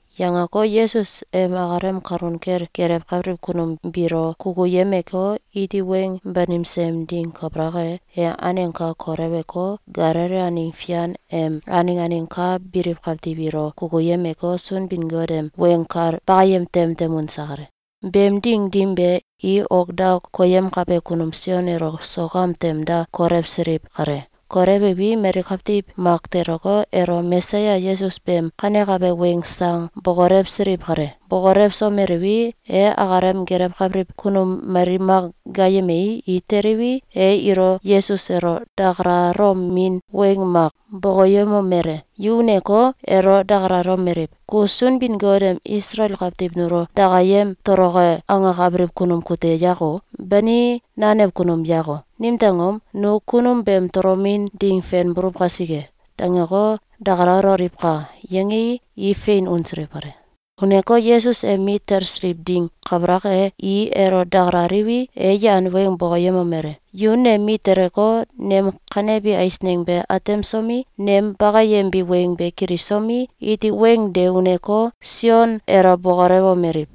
Yangeko, Yesus em akalem kalun kel gelewkabiliw kunum biilo kukuyemeko, iti weng banimse em ding kabalak e, e aneng ka koleweko, Galili aneng fian em aneng aneng ka biliw kawtiw ilo kukuyemeko, Sunbin-Got em weng kal bakayem tem tem unse kale. Beem ding dim be, i ok da koyemkabe kunum Sion elo sok am tem da kolewsiliw kale. Kolewiwi, mali kawtiw mak teleko, elo Mesaya Yesus beem kanekabe weng sang bokolewsiliw kale. Bokolewsomeliwi, e akalem gelewkabiliw kunum mali mak gaayemei, i teliwi, e ilo Yesus elo dakalalomin weng mak bokoyemomele: “Yu uneko, elo dakalalomeliw: ‘Ku Sunbin-Got em Isalael kawtiw nulo dakayem toloke angakabiliw kunum kute yako? Bani nanew kunum yako? Nimtew angom? Nu kunum beem tolomin ding fen buluw kasike.’, dangeko, dakalaloliwka!”, yangei, i fein unsiliw kale. Uneko, Yesus em mit talsiliw ding kabalak e, i elo dakalaliwi, e yan weng bokoyemomele: “Yu nem mit teleko, nem kanebi eisneng be atemsomi, nem bakayembi weng be kilisomi, iti weng de uneko, Sion elo bokolewomeliw: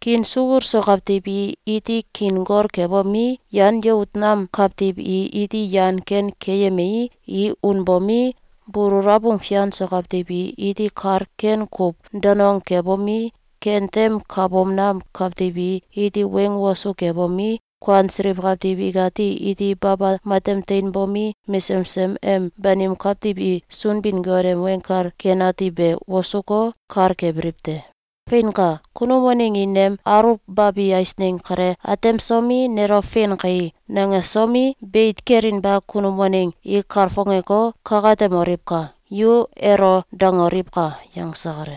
‘Kiin sukul so kawtiw i iti kiin gol kebomi, yan yout nam kawtiw i iti yan ken keyemii, i unbomi, bulul abung fian so kawtiw i iti kal ken kuw danong kebomi, kentem kabom nam kawtiw i iti weng wosu kebomi, kuansiliw kawtiw ikati iti baba matem teinbomi, mesesem em banim kawtiw i Sunbin-Got em Weng Kal Ken Ati be wosuko, kal kebiliw te. Feinka! Kunum waneng i nem aluwbabi eisneng kale atemsomi, nelo ‘Fein kai!’, nangesomi, beit kelinba kunum waneng i kalfongeko, kakatemoliwka!’, yu elo dangoliwka!”, yangse kale.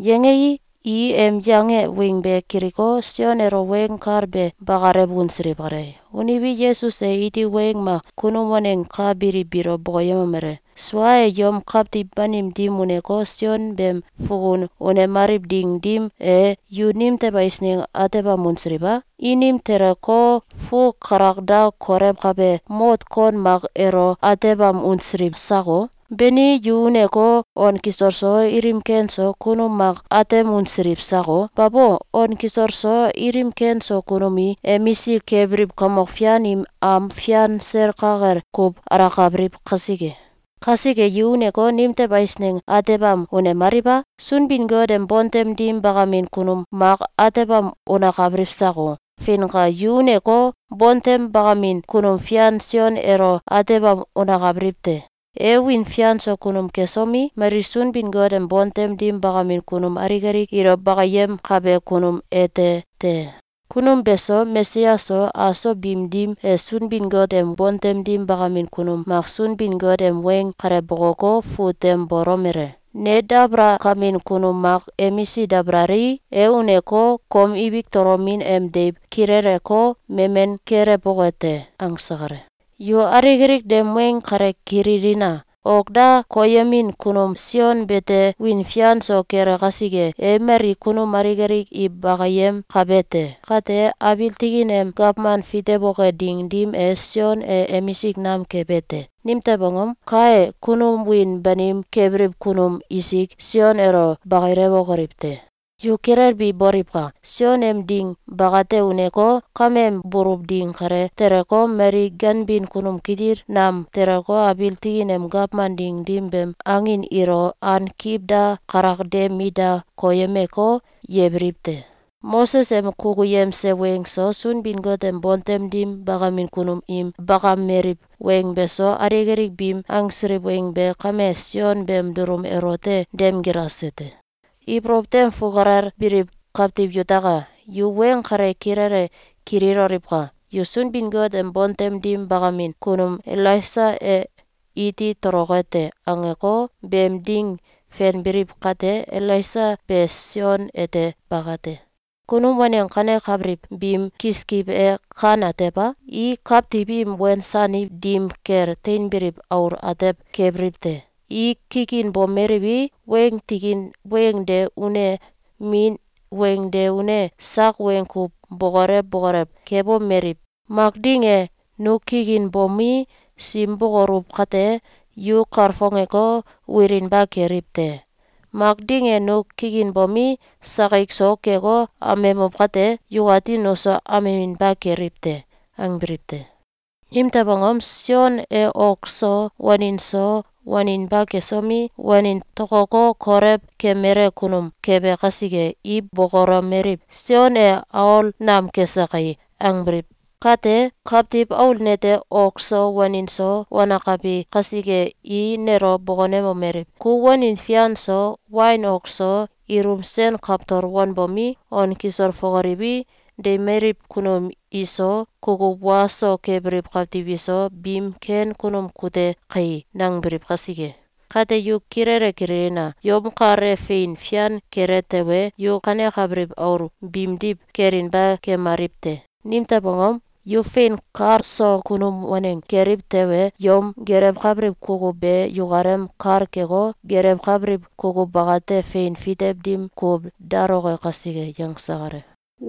Yangei, i em yange weng be kiliko, Sion elo weng kal be bakalew unsiliw kale. Uniwi, Yesus e iti weng mak kunum waneng ka biliw biilo bokoyemomele: “Sua e, yom kawtiw banim dim uneko, Sion beem fukun unemaliw ding dim e, yu nimtew eisneng atebam unsiliw a? Inim teleko, fuu kalakda kolewkabe mot kon mak elo atebam unsiliw sako? Bani yu uneko, on kisol so, ilim ken so, kunum mak atem unsiliw sako? Babo! On kisol so, ilim ken so kunum i emisik kebiliw kamok fian im am fian sel ka kel kuw alakabiliw kasike. Kasike, yu uneko, nimtew eisneng atebam unemaliw a? Sunbin-Got em bontem dim bakamin kunum mak atebam unakabiliw sako? Feinka! Yu uneko, bontem bakamin kunum fian Sion elo atebam unakabiliw te. E wiin fian so kunum kesomi, mali Sunbin-Got em bontem dim bakamin kunum alik alik ilo bakiyemkabe kunum ete te. Kunum be so, Mesaya so, aso biim dim e Sunbin-Got em bontem dim bakamin kunum mak Sunbin-Got em weng kale bokoko, fut tem bolomele: ‘Ne dabalakamin kunum mak emisik dabalalii, e uneko, kom ibik tolomin em deiw kileleko, memen kelewboke te.’, angse kale. Yu alik alik nem weng kale kililina! Ok da koyemin kunum Sion beete wiin fian so kele kasike, e mali kunum alik alik i bakiyemkabe te. Kate, abiil tikin em gawman fitewoke ding dim e, Sion e emisik nam kebe te. Nimtew angom? Kae, kunum wiin banim kebiliw kunum isik Sion elo bakilewokoliw te. Yu kilelbi boliwka! Sion em ding bakate uneko, kameem buluw ding kale teleko, mali ganbin kunum kitil nam teleko, abiil tikin em gawman ding dim beem angin ilo ankiw da kalak de mit da koyemeko, yebiliw te. Moses em kukuyemse weng so, Sunbin-Got em bontem dim bakamin kunum im bakameliw weng beso, alik alik biim angsiliw weng be kame Sion beem dulum elote dem gilase te. Ibolow tem fukalel biliw kawtiw yutaka! Yu weng kale kilele kililoliwka! Yu ‘Sunbin-Got em bontem dim bakamin kunum Elaisa e iti toloke te!’, angeko, beem ding fenbiliw kate, Elaisa be Sion ete bakate. Kunum waneng kanekabiliw biim kiskiw e kan atew a? I kawtiw im wensaniw dim kel teinbiliw aul atew kebiliw te. I kikinbomeliwi, weng tikin weng de une, min weng de une sak weng kuw bokolew bokolew kebomeliw: ‘Mak ding e, nu kikinbomi, sim bokoluw kate, yu kalfongeko, wilinba keliw te! Mak ding e, nu kikinbomi, sakik so keko, amemuw kate, yukati nuso ameminba keliw te.’, angbiliw te. Nimtew angom? Sion e ok so, wanin so, waninba kesomi, wanin tokoko kolew kemele kunum kebe kasike, i bokolomeliw: ‘Sion e aol nam kese kai!’, angbiliw kate, Kawtiw Aul nete ok so, wanin so, wanakabi kasike, i nelo bokonemomeliw: ‘Ku wanin fian so, wain ok so, ilum sen kawtol wanbomi, on kisol fokoliwi, deimeliw kunum iso, kukuw wa so kebiliw kawtiw iso, biim ken kunum kute kai!’, nangbiliw kasike. Kate, yu kilele kililina! Yom kal e fein fian kele tewe, yu kanekabiliw aul biimdiw kelinba kemaliw te. Nimtew angom? Yu fein kal so kunum waneng keliw tewe, yom gelewkabiliw kukuw be yukalem kal keko, gelewkabiliw kukuw bakate fein fitew dim kuw daloke kasike.”, yangse kale.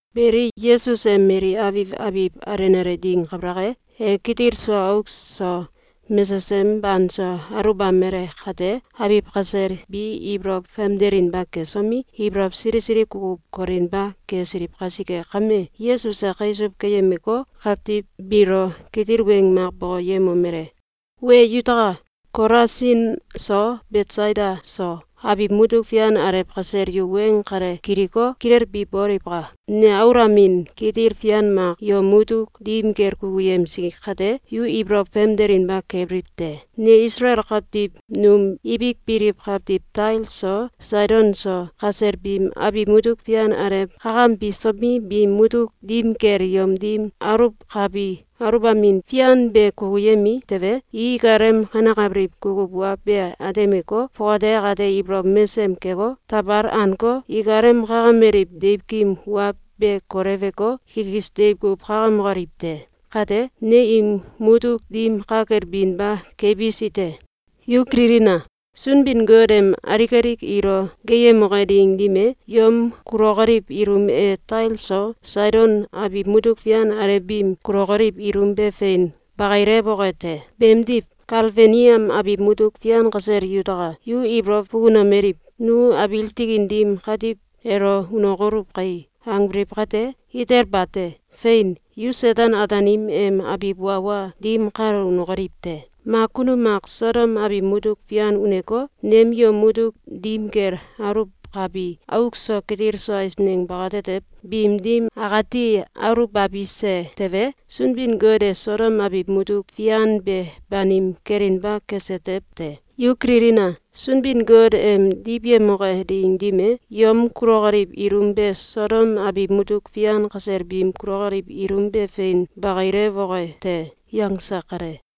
Beli, Yesus em mali abiw abiw alenale ding kabalak e, e kitil so auk so mesesem banso aluwbamale kate, abiw kasel bi ibolow famdelinba kesomi, ibolow sili sili kukuw kolinba kesiliw kasike kame, Yesus e kaisuw keyemeko, kawtiw biilo kitil weng mak bokoyemomele: “Wee yutaka! Kolasin so Betsaida so, abiw mutuk fian alew kasel yu weng kale kiliko, kilelbi boliwka! Ne aulamin kitil fian mak yom mutuk dim kel kukuyemsi kate, yu ibolow famdelinba kebiliw te. Ne Isalael kawtiw num ibik biliw kawtiw Tail so Saidon so kasel biim abiw mutuk fian alew kakambisomi, biim mutuk dim kel yom dim aluwkabi aluwbamin fian be kukuyemi tewe, i ikalem kanekabiliw kukuw wa be atemeko, fongate akate ibolow mesem keko, tawal aneko, ikalem kakameliw deiwkim wa be koleweko, kikis deiw kuw kakamokoliw te. Kate, ne im mutuk dim ka kel binba kebisi te. Yu kililina! Sunbin-Got em alik alik ilo geeyemoke ding dim e, yom kulokoliw ilum e Tail so Saidon abiw mutuk fian alew biim kulokoliw ilum be fein bakilewoke te. Beedmiw, Kafelneam abiw mutuk fian kasel yutaka! Yu ibolow fukunomeliw: ‘Nu abiil tikin dim katiw elo unokoluw kai!’, angbiliw kate, itel bate! Fein! Yu Seten-Ataanim em abiw wa wa dim kalo unokoliw te! Mak kunum mak Sodom abiw mutuk fian uneko, nem yom mutuk dim kel aluwkabi auk so kitil so eisneng bakatetew biim dim akati aluwbabise tewe, Sunbin-Got e Sodom abiw mutuk fian be banim kelinba kese tew te. Yu kililina! Sunbin-Got em diwyemoke ding dim e, yom kulokoliw ilum be Sodom abiw mutuk fian kasel biim kulokoliw ilum be fein bakilewoke te.”, yangse kale.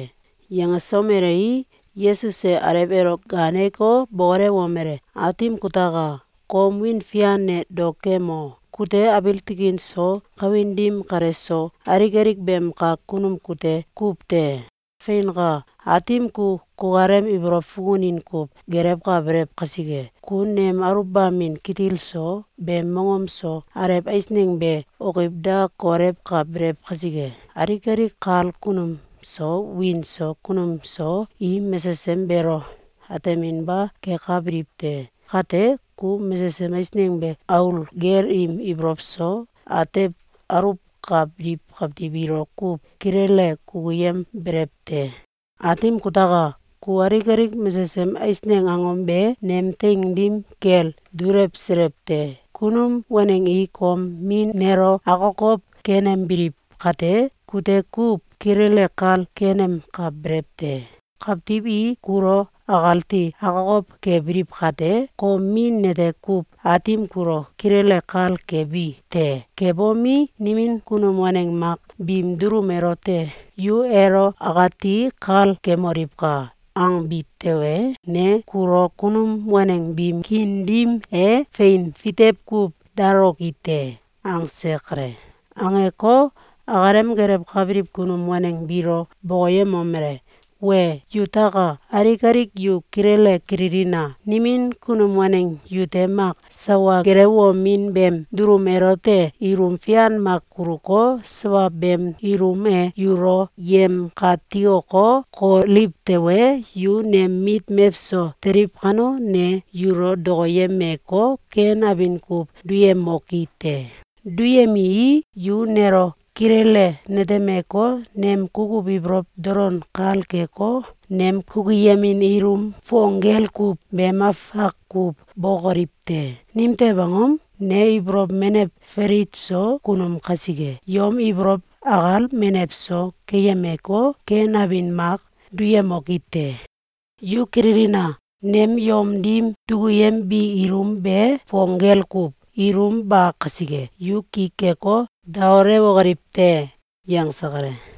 Yangesomelei, Yesus e Alew elo gaaneko, bokolewomele: “Aatim kutaka! Kom wiin fian e dao kemo! Kute abiil tikin so, kawin dim kale so, alik alik beem kak kunum kute kuw te! Feinka! Aatim ku kukalem ibolow fukunin kuw gelewkabelew kasike, ku nem aluwbamin kitil so, beem mongom so, alew eisneng be okiw da kolewkabelew kasike, alik alik kal kunum so wiin so kunum so, i mesesem beelo ateminba kekabiliw te. Kate, ku mesesem eisneng be aul gel im ibolow so atew aluwkabiliw kawtiw ilo kuw kilele kukuyembelew te. Aatim kutaka! Ku alik alik mesesem eisneng angom be nem teing dim kel dulewselew te. Kunum waneng i kom Min nelo akokow kenembiliw kate, kute kuw kilele kal kenemkabelew te. Kawtiw i kulo akati akokow kebiliw kate, kom Min nete kuw Aatim kulo kilele kal kebi te. Kebomi, nimin kunum waneng mak biim dulum elote ‘Yu elo akati kal kemoliwka!’, angbi tewe, ne kulo kunum waneng biim kiin dim e fein fitew kuw daloki te.”, angse kale. Angeko, akalem gelewkabiliw kunum waneng biilo bokoyemomele: “Wee yutaka! Alik alik yu kilele kililina! Nimin kunum waneng yute mak sawa gelewomin beem dulum elote ilum fian mak kuluko, sawa beem ilum e yulo yemkatikoko, koliw tewe, yu nem mit mewso teliw kano, ne yulo dokoyemeko, ken abin kuw duyemoki te. Duyemii, yu nelo kilele netemeko, nem kukuw ibolow dolon kal keko, nem kukuyemin ilum fong gel kuw beem afak kuw bokoliw te. Nimtew angom? Ne ibolow menew falit so kunum kasike, yom ibolow akal menew so keyemeko, ken abin mak duyemoki te. Yu kililina! Nem yom dim dukuyembi ilum be fong gel kuw, ilum ba kasike, yu ki keko, daolewokoliw te.”, yangse kale.